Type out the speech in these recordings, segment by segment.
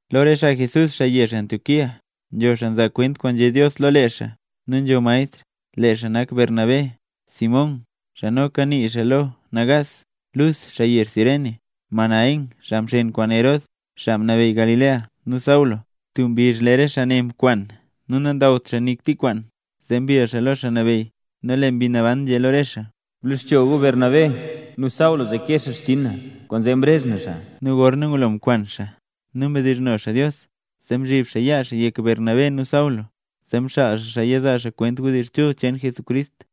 Lo re xaa Jesús, xaa yezh Antioquía, nzho xaa nzaa kwent kwaan nzhé Dios lo lee xaa nu nzho maestr. Lee xaa nak Bernabé, Simón (xaa noka nii xaa lo “Nagaas”), Lus (xaa yezh Cirene), Manaen (xaa mxeen kwaan Herod, xaa mnabeyy Galilea), nu Saulo. Tub mbizh lee re xaa ne mkwan nu nandawt xaa nik tub kwaan zee mbill xaa lo Xaa Nabeyy, nu lee Mbi Naban nzhé lo re xaa: —Bloxcho gu Bernabé nu Saulo zee kee xaa xchinn na, kwaanzee mrezh na xaa. Nu gorna ngulo mkwan xaa nu mdizhno Dios, zee mzhib xaa yaa xaa yek Bernabé nu Saulo, zee mxaal xaa xaa yizaa xaa Wdizh Chul cheen Jesucrist.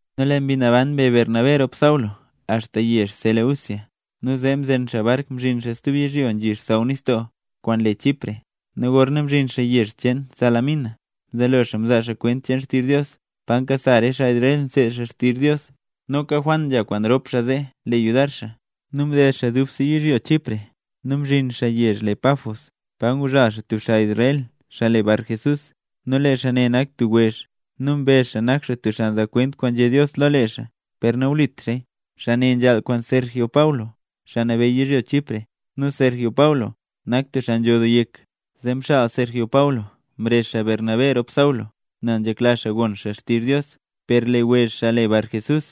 Nu Mbi Naban mbe Bernabé rop Saulo axta yezh Seleucia, nu zee mzen xaa bark mzhin xaa tub yizhyo nzhi xsaww nistoo kwaan le Chipre. Nu gorna mzhin xaa yezh cheen Salamina, mzelo xaa mzaa xaa kwent xtizh Dios pa nkasa re xaa Israel nseed xaa xtizh Dios. Noka Juan nzha kwaan rop xaa zee le yudar xaa. Mded xaa dubse yizhyo Chipre nu mzhin xaa yezh le Pafos, pa nguzhal xaa tub xaa Israel, xaa le Barjesús; nu lee xaa ne nak tub wezh nu mbezh xaa nak xaa tub xaa nzaa kwent kwaan nzhé Dios lo lee xaa, per nawlit xaaya. Xaa ne nzhaal kwaan Sergio Paulo, xaa nabeyy yizhyo Chipre. Nu Sergio Paulo nak tub xaa nzho doo yek. Zee mxaal Sergio Paulo mrezh Bernabé rop Saulo nel nzhekla xaa gon xaa xtizh Dios. Per lee wezh, xaa le Barjesús,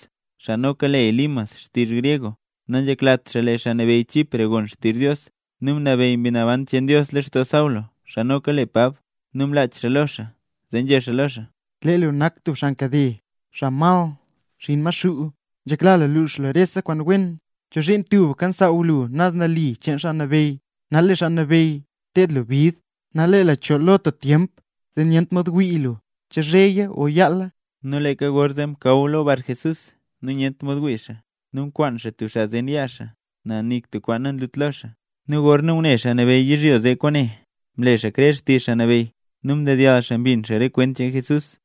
xaa noka le Elimas xtizh gryeg, nanzheklat lee xaa nabeyy Chipre gon xtizh Dios. Nu mnabeyy Mbi Naban cheen Dios lextoo Saulo, xaa noka le Pab, nu mlach xaa lo xaa, zee nzhé xaa lo xaa: —¡Lee lu nak tub xaa nkade, xaa mal, xinn Maxuu, xaa nzhekla lux rese kwaan wen! ¿Chozhiin tubka nsaaw lu naz nali cheen Xaa Nabeyy? Nal lee Xaa Nabeyy ted lu bid. Nal lee lu chool lo tub tyemp, zee nyent mod wii lu che zheya o yaala. Nu leeka gorzee mla tub yalnakaw lo Barjesús, nu nyent mod wii xaa, nu nkwaan xaa tub xaa zen yaa xaa, nel nik tub kwaan nanyunt lo xaa. Nu gorna ngune xaa nabeyy yizhyo zee kwaane, mle xaa krer xtizh Xaa Nabeyy nu ndedyall xaa mbin xaa re kwent cheen Jesús.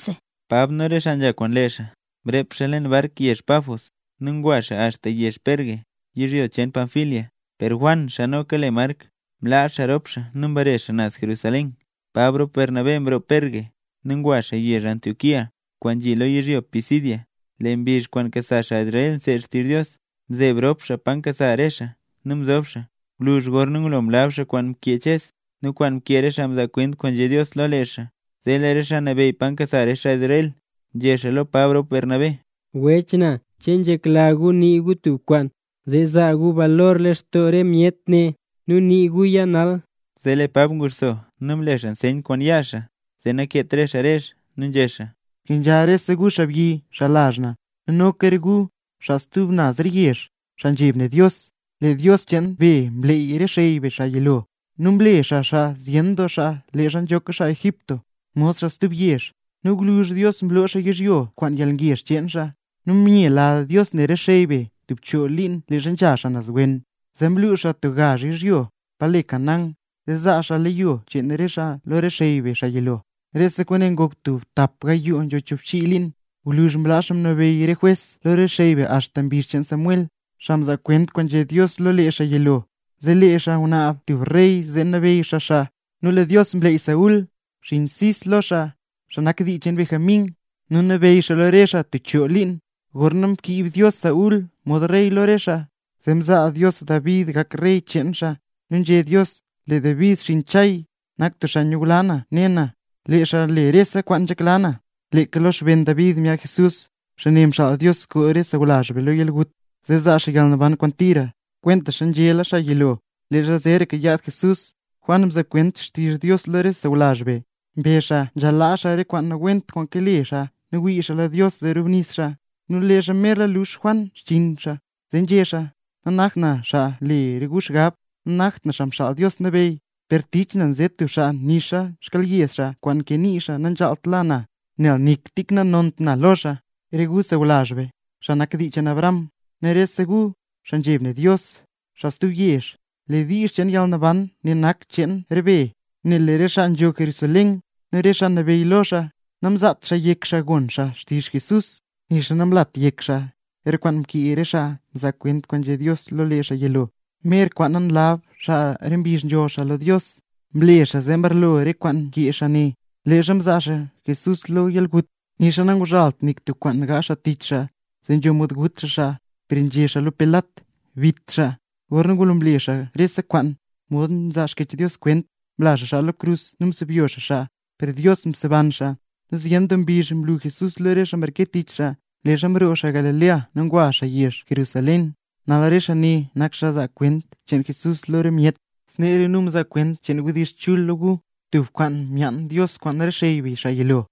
Pab nu re xaa nzha kwaan lee xaa, mrep xaa leen bark yezh Pafos nu ngwa xaa axta yezh Perge, yizhyo cheen Panfilia; per Juan (xaa noka le Mark) mlaa xaa rop xaa nu mbare xaa naz Jerusalén. Pab rop Bernabé mroo Perge, nu ngwa xaa yezh Antioquía, kwaan nzhi lo yizhyo Pisidia. Lee mbizh kwaan nkasa xaa Israel nseed xaa xtizh Dios, mzeeb rop xaa pa nkasa re xaa, nu mzob xaa. Gwluzh gorna ngulo mlab xaa kwaan mkee Ches nu kwaan mkee re xaa mzaa kwent kwaan nzhé Dios lo lee xaa, zee lee re xaa nabeyy pa nkasa re xaa Israel, nzhé xaa lo Pab rop Bernabé: —Wech na. ¿Che nzhekla gu nii gu tub kwaan, zee zaa gu balor lextoo re myet ne? ¡Nii guya nal! Zee lee Pab nguxso nu mle xaa nseyn kwaan yaa xaa zee nakeet re xaa rezh, nu nzhé xaa: —Kenzha rese gu xaabyi, xaa lazh na, nu noka re gu, xaa stub naz re yezh, xaa nzheb ne Dios. Lee Dios cheen be mleey re xey be xaa yilo, nu mle xaa xaa zyen doo xaa leezha nzhoka xaa Egipto, mod xaa stub yezh. Nu gwluzh Dios mloo xaa yizhyo zee kwaan yalngezh cheen xaa. Nu myela Dios ne re xey be tub choo liin leezha nzha xaa naz wen. Zee mlux xaa tub gazh yizhyo pa le Canaán, zee zaa xaa leyo cheen re xaa zee lo re xey be, xaa yilo. Rese kwaane ngok tub tap gayoo nzho choobchii liin. Gwluzh mlaa Xaa Nabeyy re jwes lo xey be axta re mbizh cheen Samuel, xaa mzaa kwent kwaan nzhé Dios lo lee xaa yilo. Zee lee re xaa ngunaab tub rey zee nabeyy xaa xaa; nu lee Dios mleyy Saúl, xinn Cis lo xaa, xaa nak dii cheen Benjamín. Nu mnabeyy xaa lo re xaa tub choo liin. Gorna mkiib Dios Saúl mod rey lo re xaa, zee mzaa Dios David gak rey cheen xaa, nu nzhé Dios: “Lee David xinn Isaí, nak tub xaa nyula na ne na, lee xaa le rese kwaan nzhekla na.” Leeka lo xben David myaad Jesús, xaa ne mxaal Dios koo re sawlazh be lo yalgut, nu zee zaa xaa yalnaban kwaan tira, kwentaxa nzhéla xaa yilo. Leezha zeeraka yaad Jesús, Juan mzaa kwent xtizh Dios lo rese sawlazh be. Mbezh xaa nzhaal laa xaa re kwaan nawent kwaan kale xaa nu wii xaa lo Dios zee rubnis xaa. Nu leezha merla lux Juan xchiin xaa, nzhé xaa: “Nanakt na xaa nle re gu xgab, nanakt na Xaa Xaal Dios Nabeyy; per tich na nze tub xaa nixa xkyelyed xaa kwaan nkee nii xaa nanzhaalt la na. Nel nik tik nanont na lo xaa.” ’Re gu sawlazh be, xaa nak dii cheen Abraham, nu rese gu, xaa nzheb ne Dios, xaa stub yezh; lee diizh cheen yalnaban ne nak cheen re be. Nel lee re xaa nzho Jerusalén, nu re xaa nabeyy lo xaa, namzaat xaa yek xaa gon xaa xtizh Jesús, nixa namlaat yek xaa re kwaan mkee re xaa mzaa kwent kwaan nzhé Dios lo lee xaa yilo, mer kwaana nlab xaa re mbizh nzholl be lo Dios. Mle xaa zee mbarlo re kwaan mkee xaa ne, leezha mzaa xaa Jesús lo yalgut. Nixa nanguzhalt nik tub kwaan gaazh xaa tich xaa, zee nzho mod gut xaa xaa, per nzhé xaa lo Pilat: “¡Bit xaa!” Gorna ngulo mle xaa xaa rese kwaan, mod nzaa Xkyech Dios kwent, mla xaa xaa lo krus nu msebyo xaa xaa. ¡Per Dios mseban xaa! Nu zyen doo mbizh mlu Jesús lo re xaa mreke tich xaa, leezha mroo xaa Galilea nu ngwa xaa yezh Jerusalén. Nal re xaa ne, nak xaa nzaa kwent cheen Jesús lo re myet. ’Snee re nu nzaa kwent cheen wdizh chul lo gu, tub kwaan myaan Dios kwaan re xey be xaa yilo,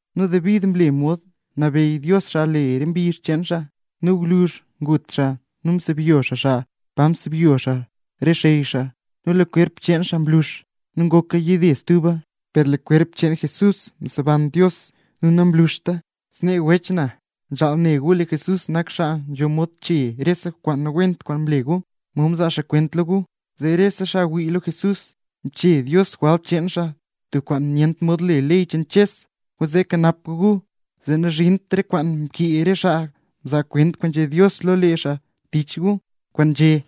Nu David mle mod mnabeyy Dios xaa re mbizh cheen xaa. Nu gwluzh ngut xaa nu msebyo xaa xaa pa msebyo xaa re xey xaa, nu lee kwerp cheen xaa mlux, nu ngoka yide stuba. Per lee kwerp cheen Jesús mseban Dios nu namluxta. ’Snee wech na, nzhaal ne gu lee Jesús nak xaa nzho mod chee rese kwaan nawent kwaan mle gu, mod nzaa nu kwent lo gu, zee lee rese xaa ngwii lo Jesús, mchee Dios jwalt cheen xaa, tub kwaan nyent mod le ley cheen Ches. Kwaanzee kanap gu gu zee nazhint re kwaan mkee re xaa mzaa kwent kwaan nzhé Dios lo lee xaa tich gu, kwaan nzhé: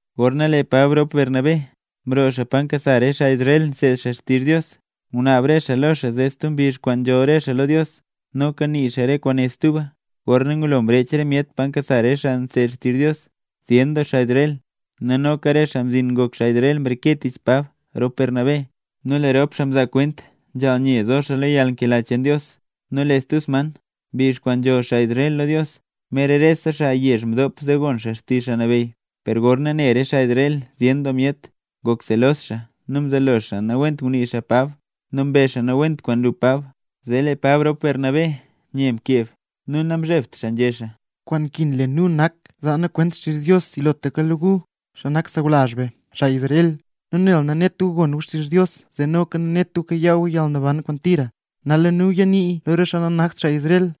Gorna lee Pab rop Bernabé mroo pa nkasa xaa Israel nseed xaa xtizh Dios, ngunaab re xaa lo xaa zee stub mbizh kwaana nzholl xaa lo Dios, noka nii xaa re kwaane stuba. Gorna ngulo mrech re myet pa nkasa xaa nseed xaa xtizh Dios, zyen doo xaa Israel, nu noka re xaa mzhin ngok xaa Israel mreke tich Pab rop Bernabé. Nu lee rop xaa mzaa kwent nzhaal nye zo xaa lo yalnkela cheen Dios. Nu lee stub sman, mbizh kwaan nzholl xaa Israel lo Dios, mer rese xaa yezh mdop zee gon xaa xtizh Xaa Nabeyy. Per gorna ne re xaa Israel zyen doo myet, ngok selos doo xaa nu mzelo xaa nawent ngunii xaa Pab nu mbezh xaa nawent kwaan nlu Pab. Zee lee Pab rop Bernabé nye mkeb nu namzhebt xaa, nzhé xaa: —Kwaan nkin le nu nak zaa nu kwent xtizh Dios yilotlaka lo gu, xaa nak sawlazh be, xaa Israel. Nu nel nanet gu gon gu xtizh Dios zee noka nanet gu kayaa gu yalnaban kwaan tira, nal lee nu ya niiya lo re xaa nanakt xaa Israel.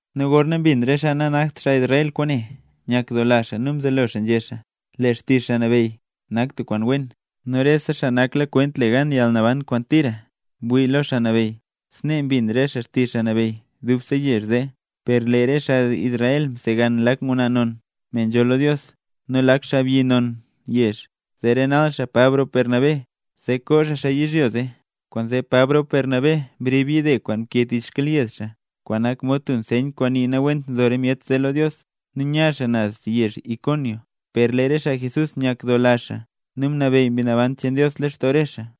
Nu gorna mbin re xaa nanakt xaa Israel kwaane, nyakdoola xaa nu mzelo xaa nzhé xaa: “Lee xtizh Xaa Nabeyy nak tub kwaan wen”. Nu rese xaa naklakwent le gan yalnaban kwaan tira, mwii xaa lo Xaa Nabeyy. Snee mbin re xaa xtizh Xaa Nabeyy dubse yezh zee. Per lee re xaa Israel msegan lak ngwnaa non, me nzholl lo Dios, nu lak xaabyi non yezh, zee renal xaa Pab rop Bernabé, zee koo xaa xaa yizhyo zee. Kwaanzee Pab rop Bernabé mrib yide kwaan nkee tich xkyelyed xaa, kwaan nak mod tub nseyn kwaan nii nawent nzo re myet zee lo Dios, nu nya xaa naz yezh Iconio. Per lee re xaa Jesús nyakdoola nu mnabeyy Mbi Naban cheen Dios lextoo re xaa.